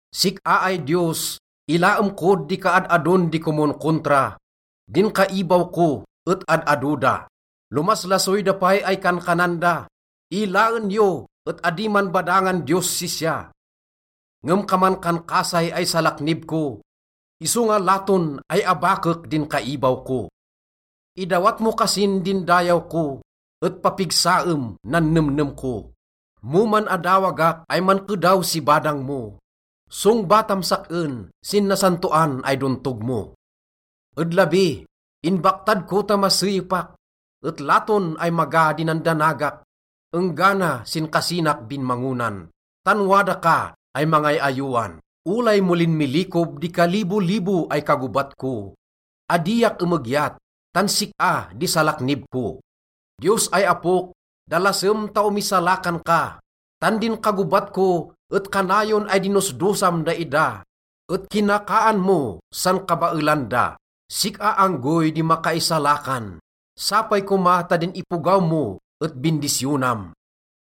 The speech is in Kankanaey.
Sik-a ay Diyos, ilaem kod di kaad-adon di komonkontra, din kaibaw ko et ad-ado da. Lomaslasoy da pay ay kankanan da, “Ilaen yo et adi man badangan Diyos sisya.” Ngem kaman kan kasay ay salaknib ko, isonga laton ay abakek din kaibaw ko. Idawat mo kasin din dayaw ko, et papigsaem nan nemnem ko. Mo man-adawagak ay mankedaw si badang mo, songbatam sak-en sin nasantoan ay dontog mo. Ed labi, inbaktad ko ta maseyepak, et laton ay maga di nandanagak enggana sin kasinak binmangonan, tan wada ka ay mangay-ayowan. Olay mo linmilikob di kalibolibo ay kagobat ko, adiak emegyat tan sik-a di salaknib ko. Diyos ay Apok, dalasem ta omisalakan ka. Tan din kagobat ko et kanayon ay dinosdosam daida et kinakaan mo san kabaelan da. Sik-a anggoy di makaisalakan, sapay koma ta din ipogaw mo et bindisyonam.